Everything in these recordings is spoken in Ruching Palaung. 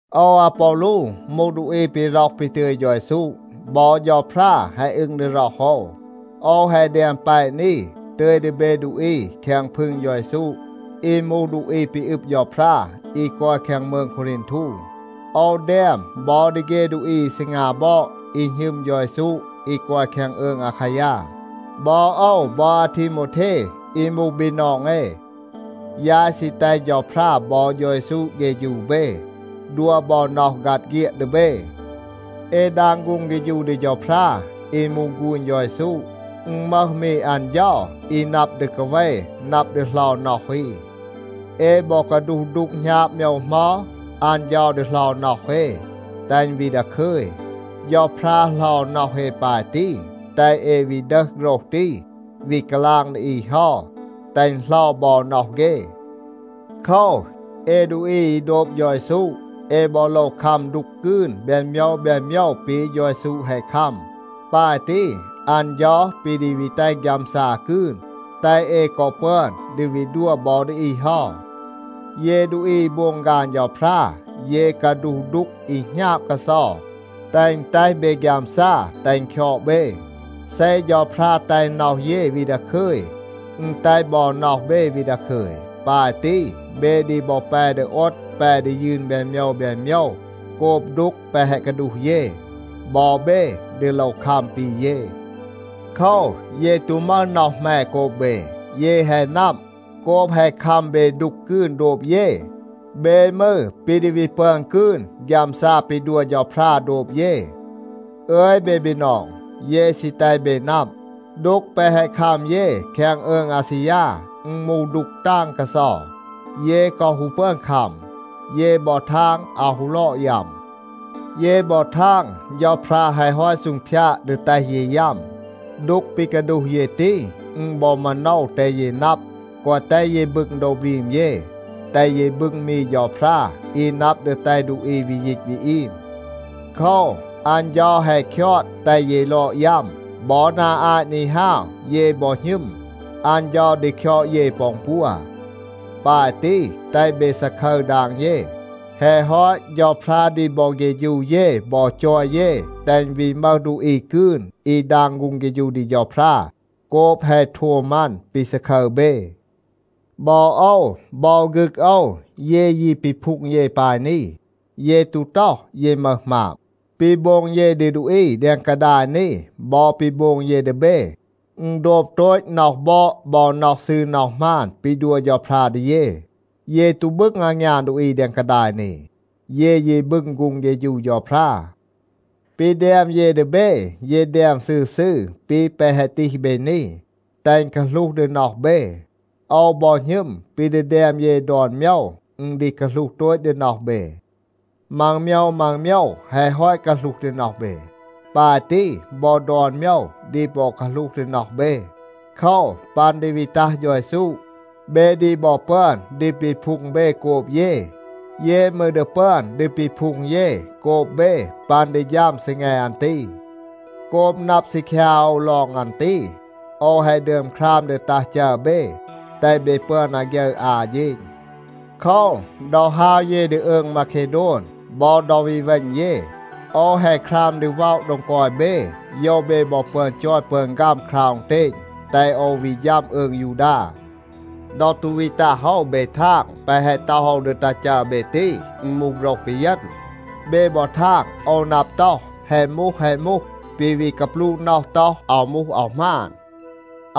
โอว อาปอลู มูห ดูอี ปี ร็อห ปี ตึย เฌา เยซู. บอ เฌาพรา แฮะ อึง ดี ร็อห โอว. โอว แฮะ แดม แปะ นี, ตึย ดี เบ ดูอี แคง พึง เฌา เยซู อี มูห ดูอี ปี อึบ เฌาพรา อี กอย แคง มืง โควรีนทู. โอว แดม บอ ดี เฆ ดูอี อี ซีงา บอด, อี หณึม เฌา เยซู อี กอย แคง อืง อาคายา. บอ โอว บอ อาทีโมวเท อี มูห บีนอง เอ, ยาย ซี แตห เฌาพรา บอ เฌา เยซู เฆฌู เบ, ดัว บอ น็อห ฆัด เฆียด ดี เบ. เอ ดาง ฆูง เฆฌู ดี เฌาพรา อี มูห ฆูณ เฌา เยซู. อึณ มึห มี อัน เฌา อี นับ ดี กาเว, นับ ดี เหลา น็อห อี. เอ บอ กาดูห ดูก หณาบ โมยว เหมา, อัน เฌา ดี เหลา น็อห เอ, แตห อึณ วี ดาคึย. เฌาพรา เหลา น็อห เอ ปาย ตี, แตห เอ วี ดึห โฆรห ตี, วี กาลาง ดี อี เฮา, แตห อึณ เหลา บอ น็อห เฆ. โคว, เอ ดูอี อี โดบ เฌา เยซู, เอ บอ โลว คัม ดูก กืน แบน โมยว แบน โมยว ปี เฌา เยซู แฮะ คัม. ปาย ตี, อัน เฌา ปี ดี วี แตห ฆยามซา กืน, แตห เอ กอ ปึอน ดี วี ดัว บอ ดี อี เฮา. เย ดูอี อี โบง ฆาน เฌาพรา, เย กาดูห ดูก อี หณาบ กาเซา, แตห อึณ แตห เบ ฆยามซา, แตห อึณ คยอด เบ. เซ เฌาพรา แตห น็อห เย วี ดาคึย, อึณ แตห บอ น็อห เบ วี ดาคึย. ปาย ตี, เบ ดี บอ แป ดี โอด, แป ดี ยืน แบน โมยว แบน โมยว โกบ ดูก แปะ แฮะ กาดูห เย. บอ เบ ดี โลว คัม ปี เย. โคว, เย ตู มึห น็อห แหม โกบ เบ. เย แฮะ นับ, โกบ แฮะ คัม เบ ดูก กืน โดบ เย, เบ มืร ปี ดี วี ปึอน กืน ฆยามซา ปี ดัว เฌาพรา โดบ เย. อึย เบ บีนอง, เย ซี แตห เบ นับ, ดูก แปะ แฮะ คัม เย แคง อืง อาซียา, อึณ มูห ดูก ตาง กาเซา. เย กอ ฮู ปึอน คัม. เย บอ ทาง อาว ฮู ลอด ยัม. เย บอ ทาง เฌาพรา แฮะ ฮอต ซูงพยาด ดี แตห เย ยัม. ดูก ปี กาดูห เย ตี, อึณ บอ มาโนว แตห เย นับ, แกวะ แตห เย บึง โดว บรีม เย, แตห เย บึง มี เฌาพรา อี นับ ดี แตห ดูอี วี ยีต วี อีม. โคว, อัน เฌา แฮะ คยอด แตห เย ลอด ยัม. บอ นา อาต นี ฮาว, เย บอ หณึม, อัน เฌา ดี คยอด เย ปอ อึณปัว. ปาย ตี, แตห เบ ซาคึร ดาง เย. แฮะ ฮอต เฌาพรา ดี บอ เฆฌู เย บอ จอย เย, แตห อึณ วี มึห ดูอี กืน อี ดาง ฆูง เฆฌู ดี เฌาพรา โกบ แฮะ โทม อัน ปี ซาคึร เบ. บอ โอว บอ ฆึก โอว, เย ยี ปีพูง เย ปาย นี. เย ตู ต็อห, เย มึห หมาบ. ปี โบง เย ดี ดูอี แดง กาดาย นี บอ ปี โบง เย ดี เบ, อึณ โดบ โตต น็อห บอด บอ น็อห ซืร น็อห หมาน ปี ดัว เฌาพรา ดี เย. เย ตู บึง อางยาน ดูอี แดง กาดาย นี. เย ยี บึง ฆูง เฆฌู เฌาพรา. ปี แดม เย ดี เบ, เย แดม ซืร ซืร ปี แปะ แฮะ ตีห เบ นี, แตห อึณ กาหลูห ดี น็อห เบ. โอว บอ หณึม ปี ดี แดม เย ดอน โมยว, อึณ ดี กาหลูห โตต ดี น็อห เบ. มัง โมยว มัง โมยว แฮะ ฮอต กาหลูห ดี น็อห เบ. ปาย ตี, บอ ดอน โมยว ดี บอ กาหลูห ดี น็อห เบ. โคว, ปัน ดี วี ตัห เฌา เยซู, เบ ดี บอ ปึอน ดี ปีพูง เบ โกบ เย. เย มืร ดี ปึอน ดี ปีพูง เย โกบ เบ ปัน ดี ฌัม ซีแง อัน ตี. โกบ นับ ซีคยา โอว ลอง อัน ตี, โอว แฮะ ดึอม คราม ดี ตัห จัร เบ, แตห เบ ปึอน อาฆยึร อา เฌณ. โคว, ดอ ฮาว เย ดี อืง มาเคโดน, บอ ดอ วี เวณ เย, โอว แฮะ คราม ดี ว็อะ โดง กอย เบ, โยว เบ บอ ปึอน จอย ปึอน ฆัม คราว อึณเตณ, แตห โอว วี ฌัม อืง ยูดา. ดอ ตู วี ตัห โอว เบ ทาง, แปะ แฮะ ต็อห โอว ดี ตัห จัร เบ ตี, อึณ มูห โฆรห ปีเยณ. เบ บอ ทาง โอว นับ ต็อห, “แฮะ มูห, แฮะ มูห,” ปี วี กาปลูะ น็อห ต็อห, “อาว มูห, อาว หมาน.”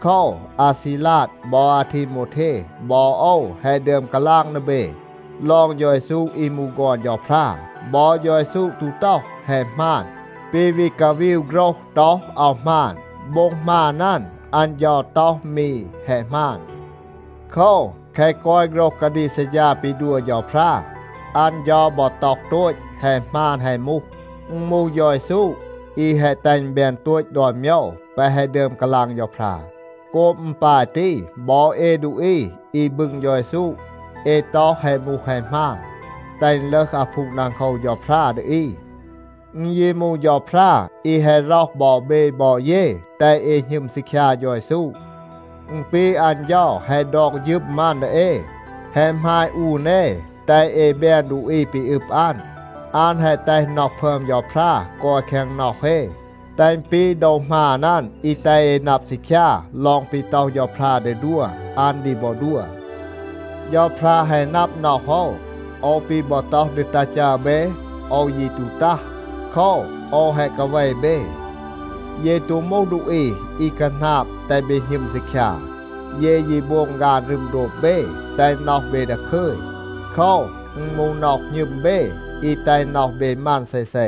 โคว, อาซีลาด บอ อาทีโมวเท บอ โอว แฮะ ดึอม กาลาง ดี เบ ลอง เฌา เยซู อี มูห ฆอน เฌาพรา. บอ เฌา เยซู ตู ต็อห, “แฮะ หมาน,” ปี วี กาวีว โฆรห ต็อห, “อาว หมาน.” โบ็ง หมาน อัน, อัน เฌา ต็อห มี “แฮะ หมาน.” โคว, แคะ กอย โฆรห กาดีก ซัดฌา ปี ดัว เฌาพรา, อัน เฌา บอ ต็อห โตต, “แฮะ หมาน แฮะ มูห.” อึณ มูห เฌา เยซู อี แฮะ แตห อึณ แบน โตต ดอน โมยว แปะ แฮะ ดึอม กาลาง เฌาพรา. โกบ อึณ ปาย ตี, บอ เอ ดูอี อี บึง เฌา เยซู, เอ ต็อห, “แฮะ มูห แฮะ หมาน,” แตห อึณ ลึห อาพูง ดังโคว เฌาพรา ดี อี. อึณ ยี มูห เฌาพรา อี แฮะ ร็อห บอ เบ บอ เย, แตห เอ หณึม ซีคยา เฌา เยซู. อึณ ปี อัน เฌา แฮะ ดอก ฌึม อัน ดี เอ, แฮะ หมาย อูน เอ, แตห เอ แบน ดูอี ปี อึบ อัน. อัน แฮะ แตห น็อห พึอม เฌาพรา กอย แคง น็อห เอ, แตห อึณ ปี โดว หมาน อัน อี แตห เอ นับ ซีคยา ลอง ปี ต็อห เฌาพรา ดี ดัว, อัน ดี บอ ดัว. เฌาพรา แฮะ นับ น็อห โอว, โอว ปี บอ ต็อห ดี ตัห จัร เบ, โอว ยี ตู ตัห. โคว, โอว แฮะ กาเว เบ. เย ตู มูห ดูอี อี คาหนาบ แตห เบ หณึม ซีคยา. เย ยี โบง ฆาน รึม โดบ เบ, แตห น็อห เบ ดาคึย. โคว, อึณ มูห น็อห หณึม เบ อี แตห น็อห เบ มัน เซเซ.